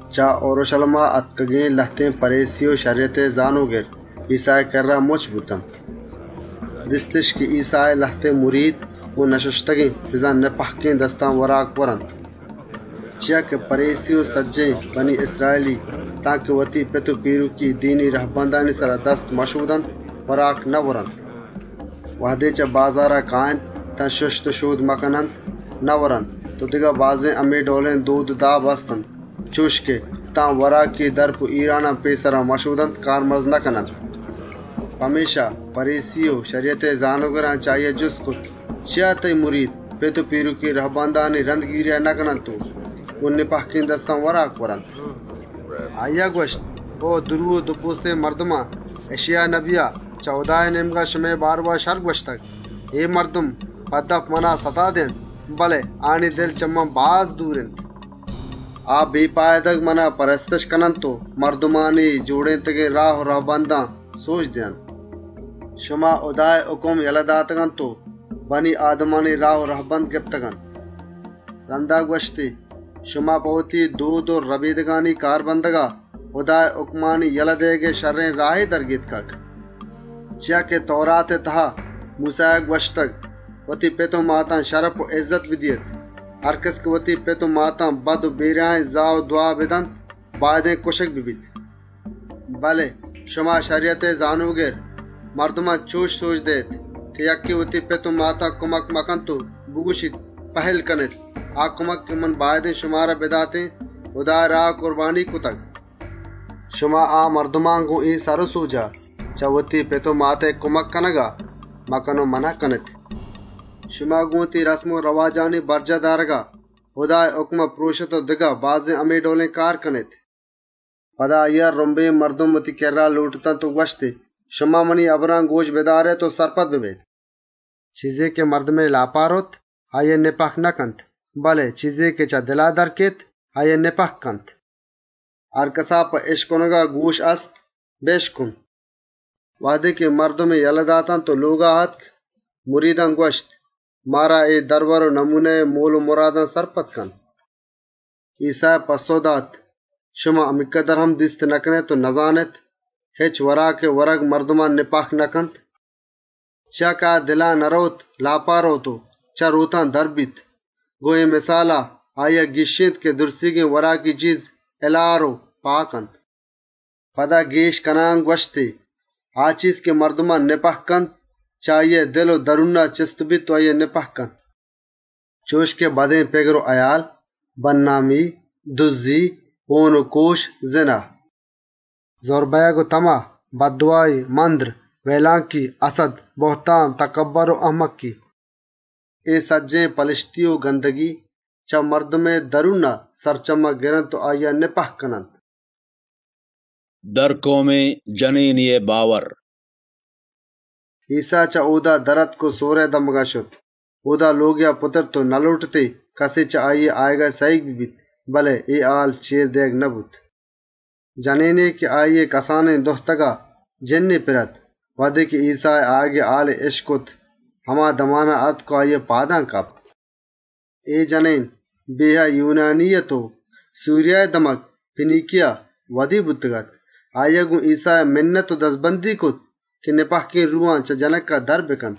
‏ چه اورْشَلیما آتکگێن لهتێن پَریسی و شَریَتئے زانۆگر ایسّائے کِرّا مُچّ بوت. ‏ دیستِش که ایسّائے لهتێن مرید گۆن نشُشتگێن، بزان گۆن سِلّ و ناپاکێن دستان وراکَ وارت. ‏ چیا که پَریسی و سجّهێن یَهودی، تانکه وتی پت و پیرُکی دینی رَهبندئے سرا دست مشۆدنت، وراکَ نئورنت. ‏ وهدے چه بازارا کاینت، تان شُشت و شۆد مکننت هچَّ نئورنت و دگه بازێن همے ڈئولێن دۆد و داب هست‌اَنت چُش که، تان وراکی دَرپ و هیرانان پێسرا مشۆدنت کارمرزَ نکننت. ‏ پمێشکا، پَریسی و شَریَتئے زانۆگران چه آییا جُست کرت: «چیا تئیی مرید پت و پیرُکی رهبندانی رَندگیریا نکننت و گۆن سِلّ و ناپاکێن دستان وراکَ ورنت؟» ‏ آییا گوَشت: «او دورو و دوپۆستێن مردمان! اِشئیا نبیا چه هُدائے نێمگا شمئے بارئوا شَرّ نبشتگ: اے مردم دپا منا سَتا دئینت، بله دلِش چه من باز دور اِنت. ‏ آ مُپتا منا پرستشَ کننت و مردمانی جۆڑێنتگێن راه و رَهبندان سۆجَ دئینت. ‏ شما هُدائے هُکم یله داتگ‌اَنت و مردمانی راه و رَهبند گپتگ‌اَنت.» ‏ رَندا گوَشتی: «شما په وتی دۆد و رهبندانی کار بندگا هُدائے هُکمانی یله دئیگئے شَرّێن راهے در گێتکگ. ‏ چیا که تئوراتئے تها موسّایا گوَشتگ: وتی پت و ماتا شرپ و اِزَّت بدئے. هرکَس که وتی پت و ماتا زا و دْوا بدنت، باید اِنت کُشگ ببیت. ‏ بله شما شَریَتئے زانۆگر، مردمان چُش سۆجَ دئیێت که یکّے وتی پت و ماتا کُمک مکنت و بگوَشیت: ‹پهِلّ کنێت، آ کُمک که من باید اِنت شمارا بداتێن، هُدائے راها کُربانیگ کرتگ.› ‏ شما آ مردما گۆن اے سر و سۆجا، چه وتی پت و ماتئے کُمک کنگا مَکَن و مَنَهَ کنێت. ‏ شما گۆن وتی دۆد و رهبندانی برجاه دارگا، هُدائے هبرانَ پرۆشێت و دگه بازێن همے ڈئولێن کارَ کنێت.» ‏ پدا آییا رُمبے مردم وتی کِرّا لۆٹت و گوَشتی: «شما منی هبران گۆش بدارێت و سرپد ببێت. ‏ چیزے که مردمئے لاپا رئوت آییا سِلّ و ناپاکَ نکنت، بله چیزے که چه دلا درَ کئیت، آییا ناپاکَ کنت. ‏ هرکَسا په اِشکنگا گۆش هست، بِشکنت.» ‏ وهدے مردمی یله داتنت و لۆگا آتک، مریدان گوَشت: «مارا اے مِسالئے مولّ و مُرادا سرپد کن.» ‏ ایسّایا گوَشت: «شما همینکدر ناسرپد اێت؟ هچ وراکێئے ورگ مردما سِلّ و ناپاکَ نکنت، ‏ چیا که آ دلا نرئوت، لاپا رئوت و چه رۆتان درَ بیت.» گۆن اے مِسالا، آییا گیشّێنت که سجّهێن ورگی چیز، هِلار و پاک اَنت. ‏ پدا گێش کنان گوَشتی: «آ چیز که مردما سِلّ و ناپاکَ کنت، چه آییئے دل و درونا چِستَ بیت و آییا ناپاکَ کنت، ‏ چُش که بدێن پِگر و هئیال، بێننگی و بَنّامی، دُزّی، هۆن و کۆش، زِنا، ‏ رُزّ بئیگ و تَمَه، بَدواهی، مَندر، وئیلانکی، هَسَدّ، کُپر، تَکبّر و اَهمکی. ‏ اے سجّهێن پَلَشتی و گَندگی، چه مردمئے درونا سرچمّگَ گرنت و آییا سِلّ و ناپاکَ کننت.» درکئومێن جنێنێئے باور ‏ ایسّا چه اۆدا در آتک و سورئے سرڈگارا شت. اۆدا لۆگێا شت و نلۆٹتی کَسے چه آییئے آیگا سَهیگ ببیت، بله اے هال چێر دئیگ نبوت. ‏ جنێنے که آییئے کسانێن جنکا جِنّے پِر اَت، وهدے ایسّائے آیگئے هالی اِشکت، هما دمانا آتک و آییئے پادان کپت. ‏ اے جنێن یونانیے اَت و سوریَهئے دَمگ پینیکیَها پێدا بوتگ‌اَت. آییا ایسّا مِنَّت و دَزبندی کرت که جِنّا چه جنکا در بکنت. ‏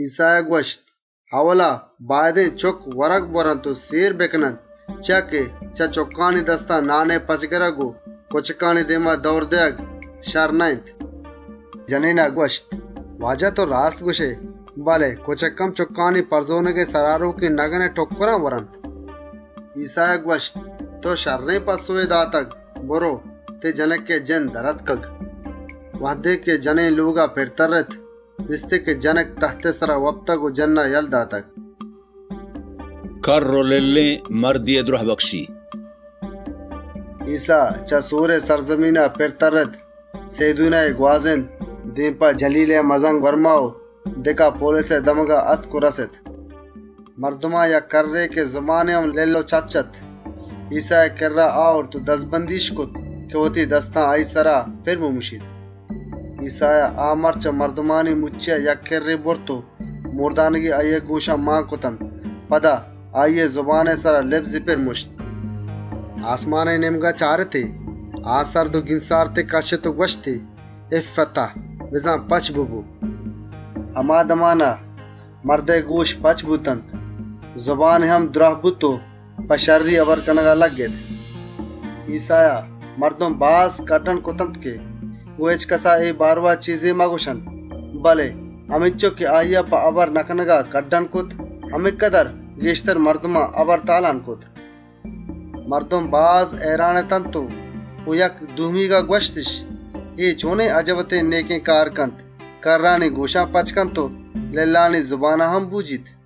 ایسّایا گوَشت: «ائولا باید اِنت چُکّ ورگ بوَرنت و سێر بکننت، چیا که چه چُکّانی دستا نانئے پَچ گِرگ و کُچکانی دێما دئور دئیگ شَرّ نه‌اِنت.» ‏ جنێنا گوَشت: «او هُداوند! تئو راستَ گوَشئے، بله کُچک هم چُکّانی پَرزۆنَگئے سر آرۆکێن نَگَنئے ٹُکّرانَ ورنت.» ‏ ایسّایا گوَشت: «تئو شَرّێن پَسّئوے دات، برئو، تئیی جنکئے جِنّ در آتکگ.» ‏ وهدے جنێن لۆگا پِر ترّت، دیستی که جنک تَهتئے سرا وپتگ و جِنّا یله داتگ. کَرّ و لِلّێن مردێئے دْرهبکشی ‏ ایسّا، چه سورئے سرڈگارا پِر ترّت، سئیدونی گوازێنت، دێم په جَلیلئے مَزَن‌گوَرم و دِکاپولیسئے سرڈگارا آتک و رَست. ‏ مردمان یک کَرّێن مردے که زبانی هم لِلّ و چِچّ اَت، ایسّائے کِرّا آورت و دَزبندی‌اِش کرت که وتی دستا آییئے سرا پِر بمُشیت. ‏ ایسّایا آ مرد چه مردمانی مُچّیا یک کِرّے برت و لَنکُکی آییئے گۆشان مان کرتنت. رندا آییئے زبانئے سرا لِبزی پِر مُشت. ‏ آسمانئے نێمگا چارتی، آه و گینسارتے کَشّت و گوَشتی: «اِفَّتَه!» (بزان «پَچ ببو!») ‏ هما دمانا، مردئے گۆش پَچ بوتنت، زبانی هم دْراه بوت و په شَرّی هبر کنگا لگِّت. ‏ ایسّایا، مردم باز کَڈّن کرتنت که گۆن هچکَسا اے بارئوا هچّ مگوَشنت، بله همینچُک که آییا په هبر نکنگا کَڈّن کرت، همینکدر گێشتر مردمان هبر تالان کرت. ‏ مردم باز هئیران اتنت و گۆن یکدومیا گوَشتِش: «اے چۆنێن اَجَبێن نێکێن کارَ کنت، کَرّانی گۆشان پَچَ کنت و لِلّانی زبانا هم بۆجیت.»